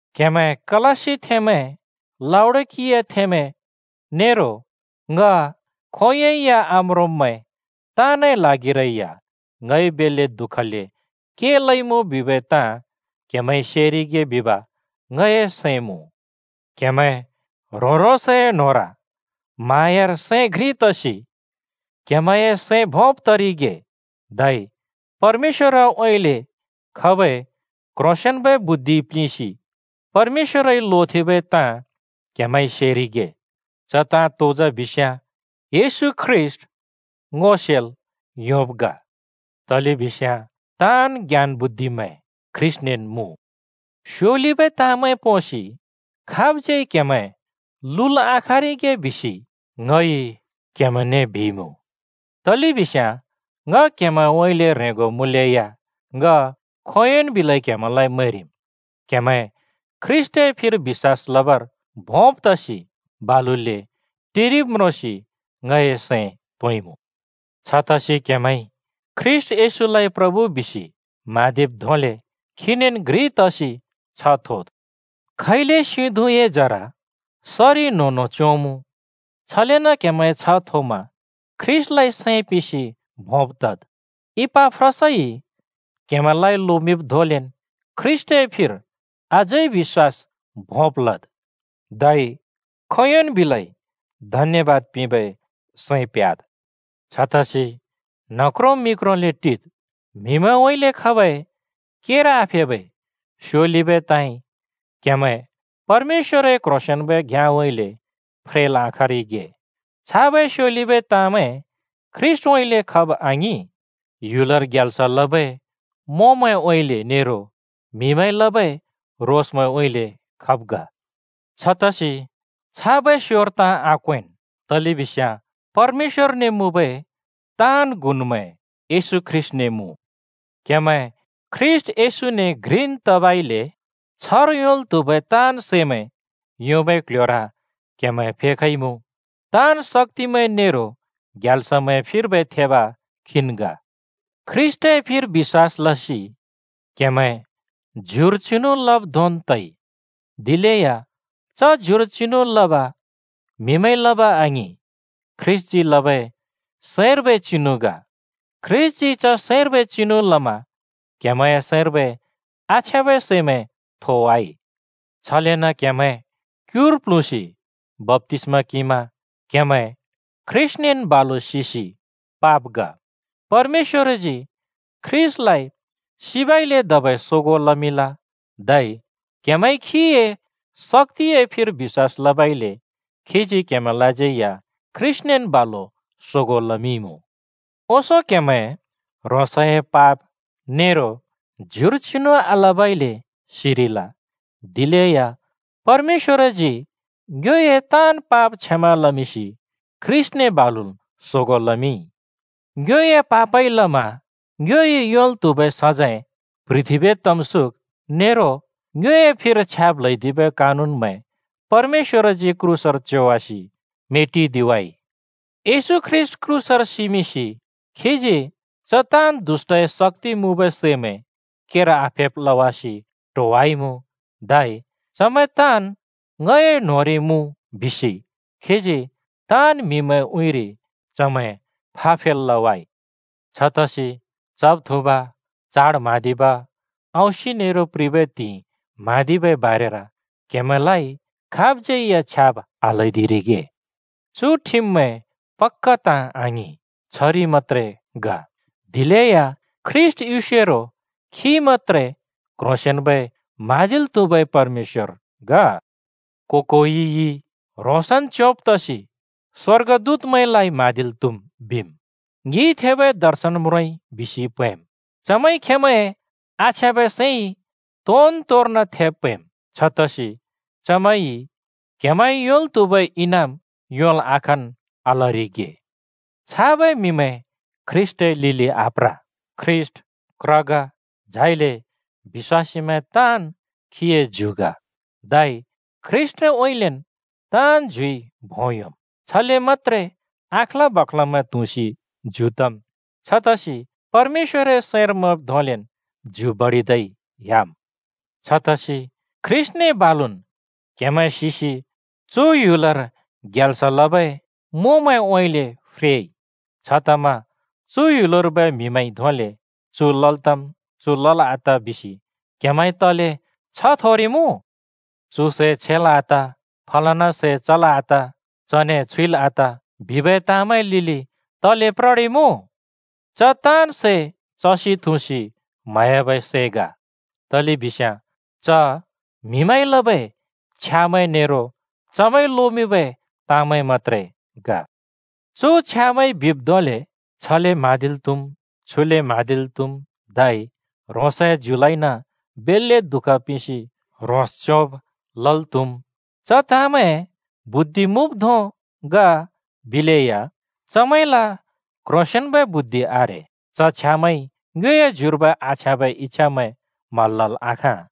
क्हेमैं कलस्सिथेंमैं, लाउडिकियाथेंमैं नेरो ङ खोंयोंइ या आम्रोंब्‍मैं ताँनए ल्हागिरै या ङइ बेल्‍ले दुःखले के लइमुँ बिबै ताँ क्‍हेमैंइ सेरिगे बिब ङए सैं मुँ। क्‍हेमैं ह्रों-ह्रोंसए न्होंर म्हाँयार सैं घ्रि तसि क्हेमैंए सैं भोंब् तरिगे, धै परमेश्‍वरउँइँले खबै क्ह्रोंसेंन्बै बुद्धिइ प्लिंसि परमेश्‍वरइ लोथेंबै ताँ क्‍हेमैंइ सेरिगे। च ताँ तो जा बिस्याँ, येशू ख्रीष्‍ट ङो सेल् योंब् ग। तलेबिस्याँ ताँन् ज्ञान बुद्धिमैं ख्रीष्‍टनेन् मुँ। स्योलिबै ताँमैं पोंसि खाबज्यै क्हेमैं लुल् आखाँरिगे बिसि ङ क्‍हेमैंने बिइमुँ। तलेबिस्याँ ङ क्हेमैंउँइँले ह्रेंगो मुँलेया ङ खोंयोंन् बिलै क्हेमैंलाइ मैंरिम्। क्‍हेमैं ख्रीष्‍टए फिर बिश्‍वास लबर भोंब् तसि बालुले टिरिब् म्रोंसि ङए सैं तोंइमुँ। छतसि क्हेमैंइ ख्रीष्‍ट येशूलाइ प्रभु बिसि म्हाँदिब् धोंले खीनेन् घ्रि तसि छ्ह थोद्। खैले सिं धुँए जरा सरि न्होंन्हों च्‍योंमु, छलेन क्‍हेमैं छ्ह थोमा ख्रीष्‍टलाइ सैं पिंसि भोंब् तद्। इपाफ्रासइ क्‍हेमैंलाइ लोमिंब् धोंलेन् ख्रीष्‍टए फिर अझै बिश्‍वास भोंब् लद्। धै खोंयोंन् बिलै धन्‍यबाद पिंबै सैं प्‍ह्‍याद्। छतसि न्ह क्रों मि क्रोंले टिद्! म्‍हिउँइँले खबै केर आफेबै स्योलिबै ताँइ क्‍हेमैं परमेश्‍वरए क्ह्रोंसेंन्बै घ्‍याँउँइँले फ्रेल् आखाँरिगे। छाबै स्योलिबै ताँमैं ख्रीष्‍टउँइँले खब आङिं, ह्‌युल ग्याल्स ओलेबै मोंमैंउँइँले नेरो म्‍हिमैंइ लबै रोसमैंउँइँले खब् ग। छतसि छाबै स्‍योर ताँ आक्‍वेंन्, तलेबिस्याँ परमेश्‍वरने मुँबै ताँन् गुनमैं येशू ख्रीष्‍टने मुँ। क्हेमैं ख्रीष्‍ट येशूने घ्रिन् तबइले छ्हर योंल् त्हुबै ताँन् सैमै योंबै क्ल्ह्‍योर क्हेमैं फेखइमुँ। ताँन् शक्‍तिमैं नेरो ग्याल्समैंए फिर्बै थेब खीन् ग। ख्रीष्‍टए फिर बिश्‍वास लसि क्हेमैं ज्युर चिनु लब् धोंन् तइ। दिलेया च ज्युर चिनु लब म्‍हिमैंइ लब आङिं, ख्रीष्‍टजी लबै सैंर्बै चिनु ग। ख्रीष्‍टजी च सैंर्बै चिनु लमा क्हेमैंए सैंर्बै आछ्याँबै सिमैं थोवाइ। छलेन क्‍हेमैं क्‍युर प्‍ल्हुँसि बप्‍तिस्मा किंमा क्हेमैं ख्रीष्‍टनेन् बालु सिसि पाब् ग। परमेश्‍वरजी ख्रीष्‍टलाइ सिबइले धबै सोगों लमिंल, धै क्हेमैंइ खीए शक्‍तिए फिर बिश्‍वास लबइले खीजी क्हेमैंलाज्यै या ख्रीष्‍टनेन् बालु सोगों लमिंइमुँ। ओंसों क्‍हेमैं ह्रोंसए पाप नेरो ज्युर चिनु आलबइले सिरिल, दिलेया परमेश्‍वरजी ङ्योए ताँन् पाप क्षमा लमिंसि ख्रीष्‍टने बालुन् सोगों लमिंइ। ङ्योए पापइ लमा ङ्योइ योंल् त्हुबै सजैं प्‍ह्रिथेंबै तमसुक नेरो ङ्योए फिर छ्याब् ल्हैदिबै कानुनमैं परमेश्‍वरजी क्रूसर च्योमिंसि मेटिदिवाइ। येशू ख्रीष्‍ट क्रूसर सिमिंसि खीजी च ताँन् दुष्‍टए शक्‍ति मुँबै सैमैं केर आफेब् लवासि ट्होवाइमुँ। धै “चमैं ताँन् ङए न्होंर मुँ” बिसि खीजी ताँन् म्‍हिमैंए उँइँरि चमैं फाफेल् लवाइ। छतसि चब-थुँब, चाड म्हाँदिब, औंसि नेरो प्रिबै त्हिंइ म्हाँदिबै बारेर क्‍हेमैंलाइ खाबज्‍यै छ्याब् आल्‍हैदिरिगे। चु ठिममैं पक्‍का ताँ आङिं, छरि मत्‍त्रे ग, दिलेया ख्रीष्‍ट युसेरो खी मत्‍त्रे क्‍ह्रोंसेंन्‍बै म्हाँदिल् त्‍हुबै परमेश्‍वर ग। को-कोइइ “ह्रोंसन् च्‍योंब् तसि स्‍वर्गदूतमैंलाइ म्‍हाँदिल् त्‍हुम्,” बिम्। “ङिइ थेबै दर्शन म्रोंइ” बिसि प्हैंम्, चमैंइ खेंमैंए आछ्याँबै सैंइ तोन-तोर्न थेब् प्‍हैंम्। छतसि चमैंइ क्‍हेमैंइ योंल् त्हुबै इनाम योंल् आखाँन् आलरिगे। छाबै म्‍हिमैं ख्रीष्‍टए लिलि आप्र। ख्रीष्‍ट क्र ग, झाइले बिश्‍वासीमैं ताँन् खीए ज्यु ग, धै ख्रीष्‍टउँइँलेन् ताँन् ज्युइ भों योंम्। छले मत्‍त्रे अँख्ला बाख्लमैं त्हुँसि ज्यु तम्। छतसि परमेश्‍वरए सैंर मैंब् धोंलेन् ज्यु बडिदै ह्‍याम्। छतसि ख्रीष्‍टने बालुन् क्हेमैं सिसि चु ह्‌युल ग्याल्स ओलेबै मोंमैंउँइँले फ्रेइ। छतमा चु ह्‍युलर्बै म्हिमैंइ धोंले “चु लल् तम्, च लल् आत” बिसि क्हेमैंइ तले छ्ह थोरिमुँ? “चु सै छेल् आत,” “फलना सै चल् आत,” “चने छुइल् आत,” बिबै ताँमैंए लिलि तले प्ररिमुँ? (च ताँन् सै चसि थुँसि म्‍हयाब् ग।) तलेबिस्याँ च म्‍हिमैंइ लबै छ्यामैं नेरो चमैंइ लोमिंबै ताँ मत्‍त्रे ग। चु छ्यामैंइ बिब् धोंले “छले म्हाँदिल् त्हुम्, छुले म्हाँदिल् त्हुम्!” धै “ह्रोंसए ज्युलाइन बेल्‍ले दुःख पिंसि ह्रोंस च्योंब् लल् त्हुम्!” च ताँमैं बुद्धि मुँब् धों ग बिलेया चमैंल क्ह्रोंसेंन्बै बुद्धि आरे। च छ्यामैंइ ङ्योए ज्युर्बै आछ्याँबै इच्‍छामैं म्हल् लल् आखाँ।